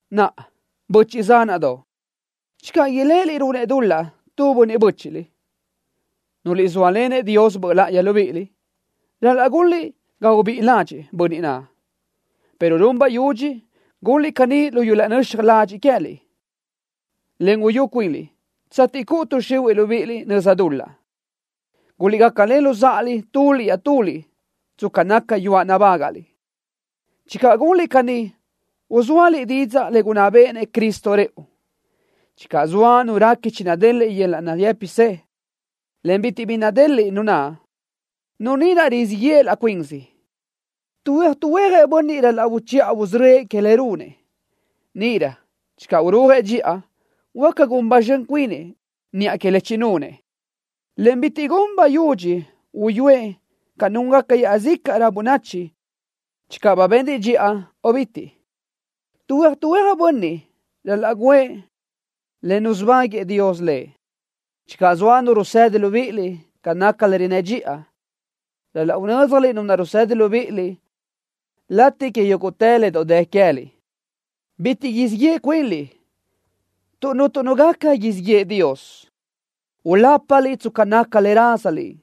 Naʼa, böchiʼ zánaʼdoʼ, channö iléʼeliʼ runëʼ dul-laʼ tu bönniʼ bö́chiʼliʼ, nuliʼ zóalenëʼ Dios Böʼ láʼayi libíʼiliʼ, ral-laʼ gunliʼ ga ubíʼi ládxëʼë bönniʼ naʼ, pero run bayudxi gunliʼ caní lu yöl-laʼ nöxaj ladxiʼ queë́liʼ, en uyú cuinliʼ tsateʼ cuʼu tuʼ xihuiʼ libíʼiliʼ nöza dul-laʼ. Guliʼgácalen luzáʼaliʼ tuliʼ iaʼtuliʼ tsca naca yuáʼ nabágaʼliʼ. Channö gunliʼ caní uzóaliʼ didzaʼ le gunná béʼenëʼ Cristo rëʼu. Channö zoa nu réqui chinadeliʼ yöl-laʼ nayë́pisë, en bitiʼ bi nadeliʼ nu naʼ, nu ni naʼ rizíʼ yeʼe laʼ cuinsi. Tuhuéaj tuhuéajëʼ bönniʼ ral-laʼ uchiʼa usörö́ëʼ que le runëʼ. Níʼirö channö urúajëʼ dxiʼa, huáca gun ba zxön cuinëʼ niʼa que le chinunëʼ, en bitiʼ gun bayudxi uyúëʼ ca núngaca iaʼzícaʼrö bönachi channö ba benrëʼ dxiʼa o cabí. Tuhuéaj tuhuéajëʼ bönniʼ ral-laʼ guʼë le nusubáguëʼë Dios lëʼ. Channö zoa nu rusedi libíʼiliʼ ca naca le rinnë́ dxiʼa, ral-laʼ unö́dzjaliʼ nu naʼ rusedi libíʼiliʼ latiʼ que yúguʼtë le doʼ dë queë́liʼ. Bitiʼ siʼ yeʼe cuinliʼ tuʼ cuntu nu gaca siʼ yeʼe Dios. Ulápaliʼ tsca naca le rázaliʼ.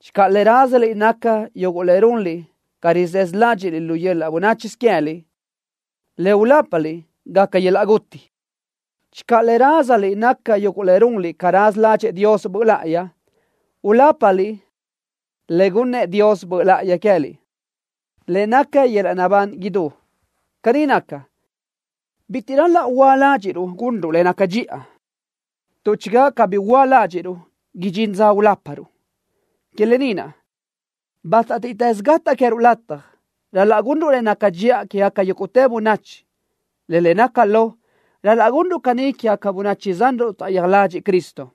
Channö le rázaliʼ naca yuguʼ le runliʼ ca rizësö ládxiʼliʼ lu yöl-laʼ bönáchisö queë́liʼ, le ulápaliʼ gaca yöl-laʼ guti. Channö le rázaliʼ naca yuguʼ le runliʼ ca raza ládxëʼë Dios Böʼ Láʼayi, ulápaliʼ le gunnëʼ Dios Böʼ láʼayi queë́liʼ, le naca yöl-laʼ naʼbán idú. Caní naca, bitiʼ ral-laʼ huöa ládxiʼruʼ gunruʼ le naca dxiʼa, tuʼ channö cabí huöa ládxiʼruʼ, idxín dza uláparuʼ. Que lë ni naʼ, bátatiʼtës gataʼ queë́ruʼ lataj, ral-laʼ gunruʼ le naca dxiʼa quégaca yúguʼtë bönachi, en le naca lo, ral-laʼ gunruʼ caní quégaca böchiʼ zanruʼ taʼyija ladxiʼ Cristo.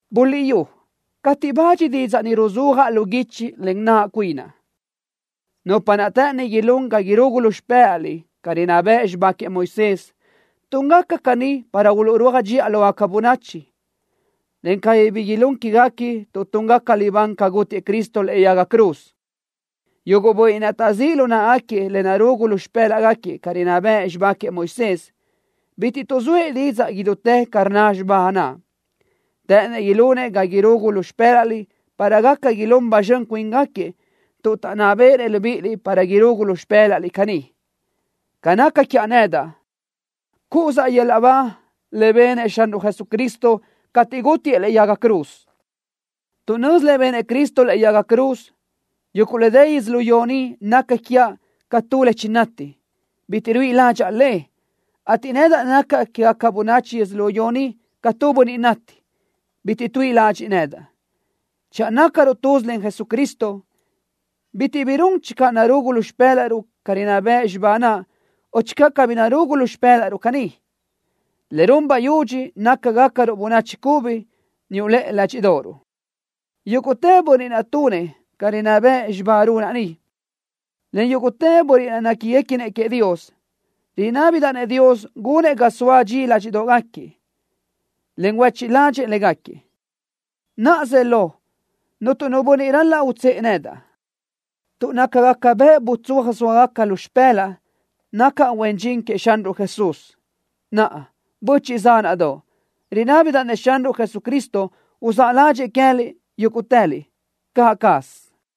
Buliʼyú cateʼ bach didzaʼ ni ruzúajaʼ lu guichi len naʼ cuinaʼ. Nupa naʼ të́ʼëni ilún ga irugu lu xpë́laʼliʼ ca rinná bëʼ xibá queëʼ Moisés, túngaca caní para uluʼrúaj dxiʼa lógaca bönachi, en cabí bi ilún quéguequi tuʼ túngaca libán ca gútiëʼ Cristo lëʼe yaga cruz. Yuguʼ bönniʼ naʼ taʼzíʼ lu náʼagaquiëʼ le narugu lu xpë́laʼgaquiëʼ ca rinná bëʼ xibá queëʼ Moisés, bitiʼ tuʼzóëʼ didzaʼ idutë ca rnna xibá naʼ. Të́ʼënëʼ ilunëʼ ga irugu lu xpë́laʼliʼ para gaca ilún ba zxön cuíngaquiëʼ tuʼ taʼnná béʼenëʼ libíʼiliʼ para irugu lu xpë́laʼliʼ caní. Ca naca quiaʼ nedaʼ, cúʼusaʼ yöl-laʼ ba le benëʼ Xanruʼ Jesucristo cateʼ gútiëʼ lëʼe yaga cruz. Tuʼ nözi le benëʼ Cristo lëʼe yaga cruz, yuguʼ le dë yödzölió ni naca quiaʼ ca tu le chinati, bitiʼ ruíʼi ládxaʼa le, ateʼ nedaʼ nacaʼ quégaca bönachi yödzölió ni ca tu bönniʼ nati, bitiʼ tuíʼi ladxiʼ nedaʼ. Channö nácaruʼ tuz len Jesucristo, bitiʼ bi run channö narugu lu xpë́laʼruʼ ca rinná bëʼ xibá naʼ o channö cabí narugu lu xpë́laʼruʼ caní. Le run bayudxi naca gácaruʼ bönachi cubi niuʼ lëʼe ládxiʼdoʼoruʼ. Yúguʼtë bönniʼ naʼ tunëʼ ca rinná bë xibá runaʼ ni, en yúguʼtë bönniʼ naʼ néquiguequinëʼ queëʼ Dios, rinábidaʼ-nëʼ Dios gunëʼ ga soa dxi ládxiʼdoʼgaquiëʼ, en huéchiʼ ládxëʼë légaquiëʼ. Naʼa zë lo, cuntu nu bönniʼ ral-laʼ utsë́ʼë nedaʼ, tuʼ nácagaca bëʼ butsóa zóagaca lu xpë́laʼa nacaʼ huen dxin queëʼ Xanruʼ Jesús. Naʼa, böchiʼ zánaʼdoʼ, rinábidaʼ-nëʼ Xanruʼ Jesucristo uzáʼ ládxëʼë queë́liʼ yúguʼtëliʼ. Caʼ caz.